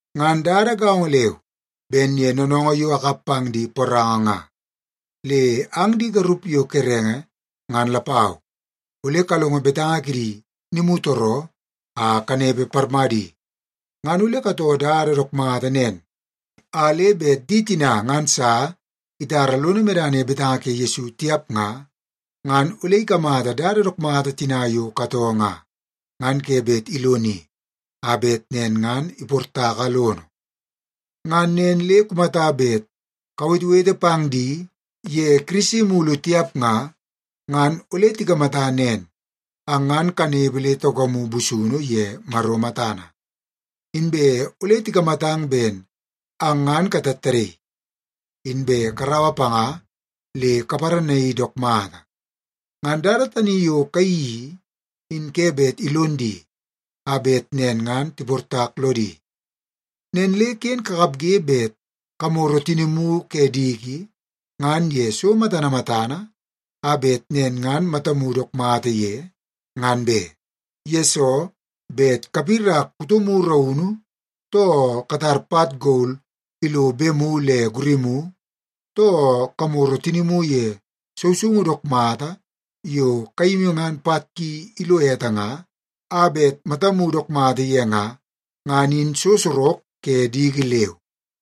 Ngan dada gaongo leu ben ye noonoongoo yo akap pang di poranga nga, le ang di garup yo kerenge ngan lapau, ole kalongo betanga kidi nimutooroo a kanepe parmadi. Ngan ole katoo dada dook mata nen, a le bet di tina ngan sa itara lono medana ye betanga ke Yesu tiap nga, ngan ole ikamata dada dook mata tina yo katoo nga, ngan ke bet iloni a bet nen ngan iportaka lono. Ngan nen le kumata bet kawetewete pang di ye Kirisi mulu tiap nga, ngan ole tikamata nen, ang ngan kanepe le taukamu busunu ye Maro matana. Inbe ole tikamatang ben ang ngan katattadaii, inbe karaua panga le kaparanaii dook mata. Ngan dada tani yo kayeii i, in ke bet ilon di a bet nen ngan tiportak lodi. Nen le ken kakapge bet kamoro tinimu ke diki ngan ye so matana matana a bet nen ngan matamu dook mata ye, ngan be. Yesoo, bet kapirak kutomu raunu, too katar pat gol ilo bemu le gurimu, too kamoro tinimu ye sousoungu dook mata yo kayimi ngan pat ki ilo ete nga, a bet matamu dook mata ye nga, ngan in so sorok ke diki leu.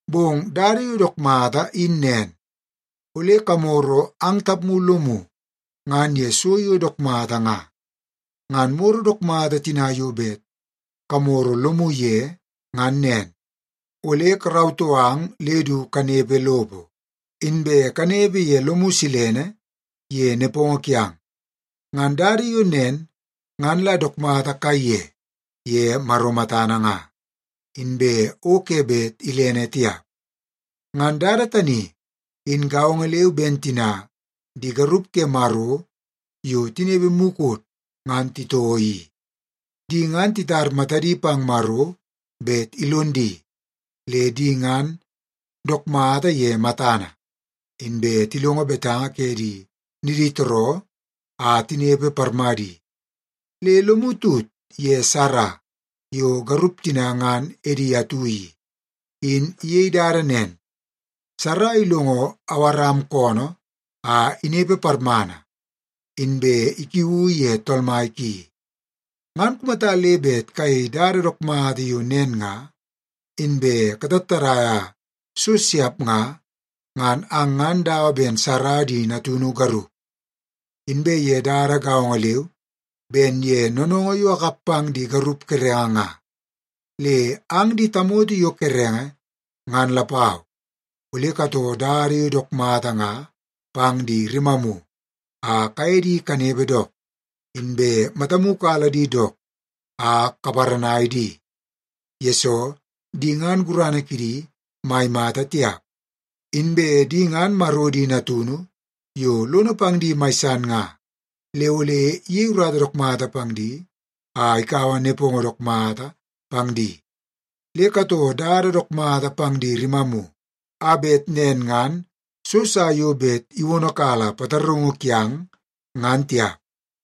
Bong dada yo dook mata in nen, ole kamoro ang tapmu lomu ngan ye so yo dook mata nga. Ngan moro dook mata tina yo bet kamoro lomu ye ngan nen, ole karautoo ang le du kanepe lopo, inbe kanepe ye lomu silene ye nepongo kiang. Ngan dada yo nen, ngan la dook mata kaiye ye Maro matana nga, inbe o ke bet ilene tiap. Ngan dada tani in gaongo leu ben tina di garup ke Maro yo tinepe mukot ngan titoo i. Di ngan titar matadi pang Maro bet ilon di, le di ngan dook mata ye matana, inbe tilongo betanga ke di niditooroo a tinepe parmadi. Le lomu tut ye Sara yo garup tina ngan edi atu i, in iyei dada nen. Sara ilongo Awaram koonoo a inepe parmana, inbe ikiuu ye tool mai ki. Ngan kumata le bet kayei dada dook mata yo nen nga, inbe katattadaia so siap nga, ngan ang ngan dawa ben Sara di natunu garup. Inbe ye dada gaongo leu ben ye noonoongoo yo akap pang di garup kerenge nga, le ang di tamoto yo kerenge ngan lapau, ole katoo dada yo dook mata nga pang di rimamu a kaye di kanepe dook. Inbe matamu kala di dook a kaparanai di, yesoo di ngan gurana kidi mai mata tiap. Inbe di ngan Maro di natunu yo lono pang di mai san nga. Le ole iyei urata dook mata pang di a ikaua nepongo dook mata pang di. Le katoo dada dook mata pang di rimamu a bet nen ngan so sa yo bet iwonokala pataraungu kiang, ngan tiap.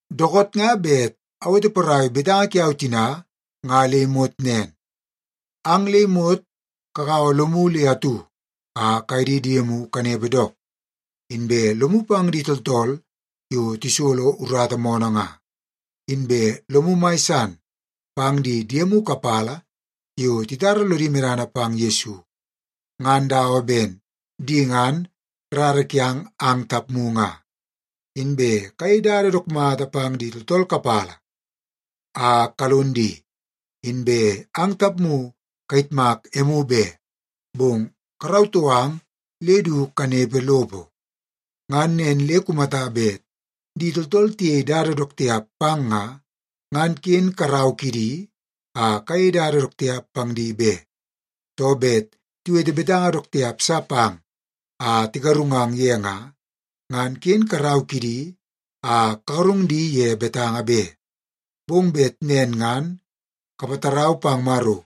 Dookoot nga bet awete porai betanga kiau tina nga le imot nen. Ang le imot kagaua lomu le atu a kaye di diemu kanepe dook, inbe lomu pang di tooltool yo tisolo urata moonoo nga. Inbe lomu mai san pang di diemu kapala yo titara lodi medana pang Yesu, ngan dawa ben di ngan rara kiang ang tapmu nga. Inbe kayei dada dook mata pang di tooltool kapala a kalon di, inbe ang tapmu kayitmak emu be, bong karautoo ang le du kanepe lopo. Ngan nen le kumata bet di tooltool tiyei dada dook tiap pang nga, ngan ken karau kidi a kayei dada dook tiap pang di be. Too, bet tiwete betanga dook tiap sa pang a tigarungang ye nga, ngan ken karau kidi a kagarung di ye betanga be. Bong bet nen ngan kapatarau pang Maro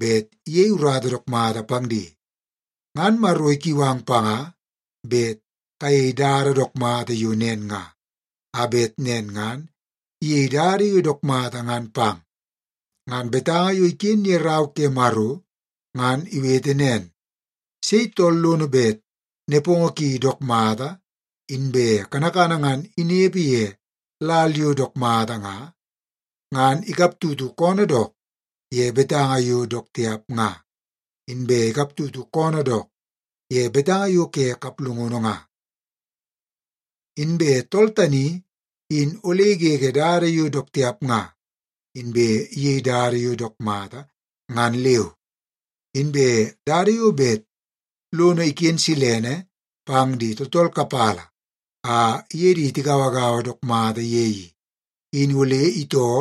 bet iyei urata dook mata pang di. Ngan Maro ikiu ang panga bet kayei dada dook mata yo nen nga, a bet nen ngan iyei dada yo dook mata ngan pang. Ngan betanga yo iken ye Rau ke Maro, ngan iwete nen, “Sei tool lono bet nepongo ki dook mata inbe kanakana ngan inepe ye lal yo dook mata nga, ngan ikaptutu koonoo dook ye betanga yo dook tiap nga, inbe ikaptutu koonoo dook ye betanga yo ke kaplungunu nga. Inbe tool tani in ole igege dada yo dook tiap nga, inbe iyei dada yo dook mata ngan leu. Inbe dada yo bet lono iken silene pang di tooltool kapala a iye di tigauagaua dook mata ye i, in ole itoo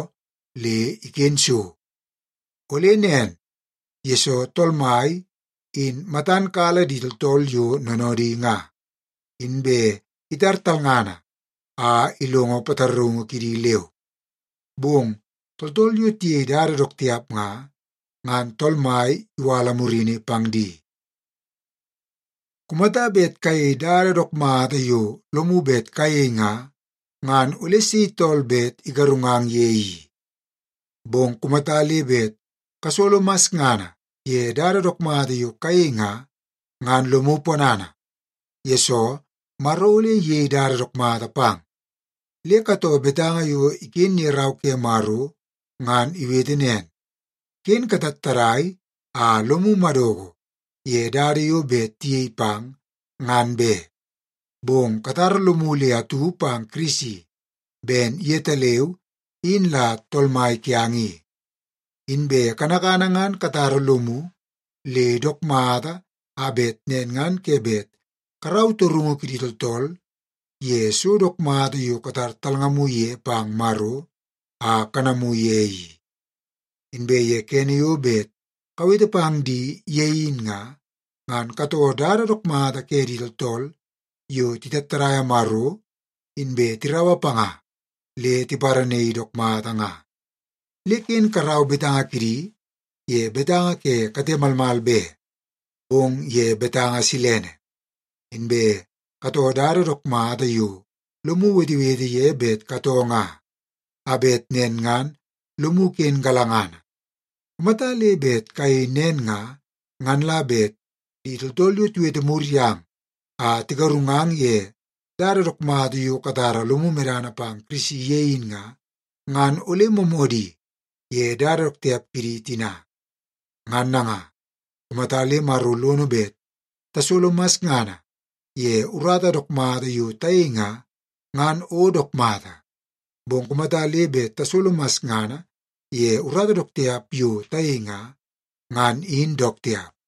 le iken so. Ole nen, yesoo Tool Mai in matan kala di tooltool yo noonoodi nga, inbe itar talngana a ilongo pataraungu kidi leu. Bong tooltool yo tiyei dada dook tiap nga, ngan Tool Mai iwala murini pang di.” Kumata bet kayei dada dook mata yo lomu bet kayei nga, ngan ole sei tool bet igarungang ye i? Bong kumata le bet kasolo masngana ye dada dook mata yo kayei nga, ngan lomu ponana, yesoo Maro ole iyei dada dook mata pang. Le katoo betanga yo iken ye Rau ke Maro ngan iwete nen, “Ken katattadai a lomu madoko ye dada yo bet tiyei pang ngan be.” Bong katara lomu le atu pang Kirisi ben yetaleu in la Tool Mai kiang i. Inbe kanakana ngan kakarata lomu le dook mata a bet nen ngan ke bet karau torungu kidi tooltool ye so dook mata yo katar matamu ye pang Maro a kanamu ye i. Inbe ye kene yo bet kawete pang di ye in nga, ngan katoo dada dook mata ke di tooltool yo titattadaia Maro, inbe tiraua panga le tiparanaii dook mata nga. Le ken karau betanga kidi ye betanga ke kate malmal be, bong ye betanga silene. Inbe katoo dada dook mata yo lomu wetewete ye bet katoo nga, a bet nen ngan lomu ken galangana. Kumata le bet kayei nen nga, ngan la bet di tooltool yo tiwete mur yang a tigarungang ye dada dook mata yo katara lomu medana pang Kirisi ye in nga, ngan ole moomoodi ye dada dook tiap kidi tina. Ngan nanga, kumata le Maro lono bet tasolo masngana ye urata dook mata yo tayei nga, ngan o dook mata. Bong kumata le bet tasolo masngana ye urata dook tiap yo tayei nga, ngan in dook tiap.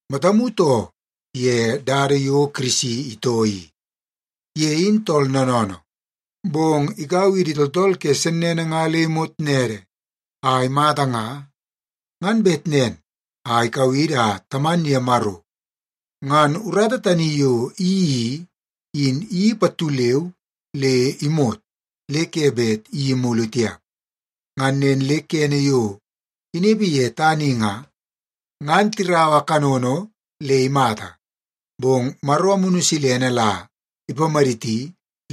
Matamu too ye dada yo Kirisi itoo i. Ye in tool noonoonoo, bong ikaua idi tooltool ke sennene nga le imot nede a imata nga, ngan bet nen a ikau idi a taman ye Maro. Ngan urata tani yo iyeii i, in iyeii pattu leu le imot, le ke bet iyeii mulu tiap. Ngan nen le kene yo inepe ye tana i nga, ngan tiraua kanono le imata, bong Maro Amunu Silene la ipamaditi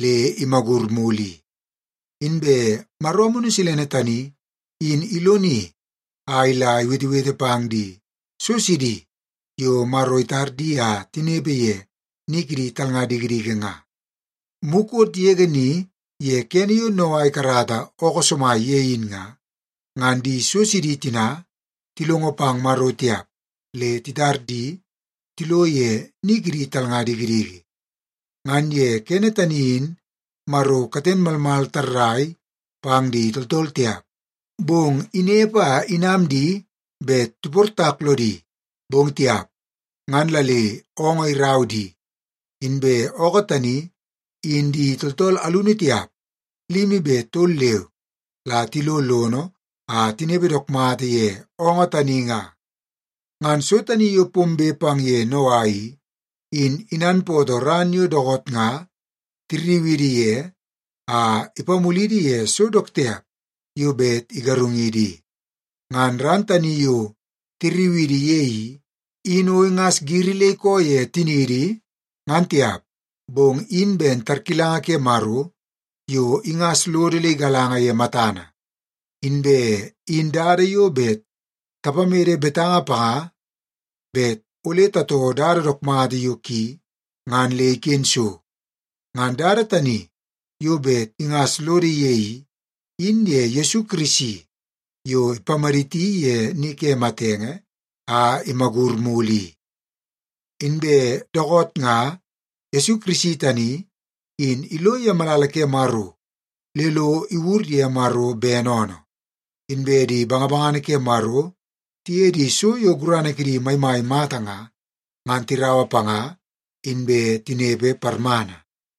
le imagur mulu i. Inbe Maro Amunu Silene tani in iloni a ila iwetewete pang di so sidi yo Maro itar di a tinepe ye ni kidi talnga dikidiki nga. Mukot yege ni ye kene yo Noa ikarata ookoo somai ye in nga, ngan di so sidi tina tilongo pang Maro tiap, le itar di tilo ye ni kidi talnga dikidiki. Ngan ye kene tani in Maro katen malmal tarrai pang di tooltool tiap, bong inepe a inam di bet tiportak lodi, bong tiap. Ngan la le oongoo irau di, inbe ookoo tani in di tooltool alunu tiap, limi be tol leu, la tilo lono a tinepe dook mata ye oongoo tani nga. Ngan so tani yo pombe pang ye Noa i, in inanpootoo ran yo dookoot nga tirriu idi ye a ipamulidi ye so dook tiap yo bet igarungidi i. Ngan ran tani yo tirriu idi ye i, in o ingas giri le ikoo ye tiniidi, ngan tiap, bong in ben tarkilanga ke Maro yo ingas lodo le igalanga ye matana, inbe in dada yo bet tapamede betanga panga bet ole tatoo dada dook mata yo ki ngan le iken so. Ngan dada tani yo bet ingas lodo ye i, in ye Yesu Kirisi yo ipamaditi ye ni ke matenge a imagur mulu i. Inbe dookoot nga Yesu Kirisi tani in ilo ye malala ke Maro le lo iwur ye Maro bene oonoo. Inbe di bangabangana ke Maro tiye di so yo gurana kidi maimai mata nga, ngan tiraua panga, inbe tinepe parmana.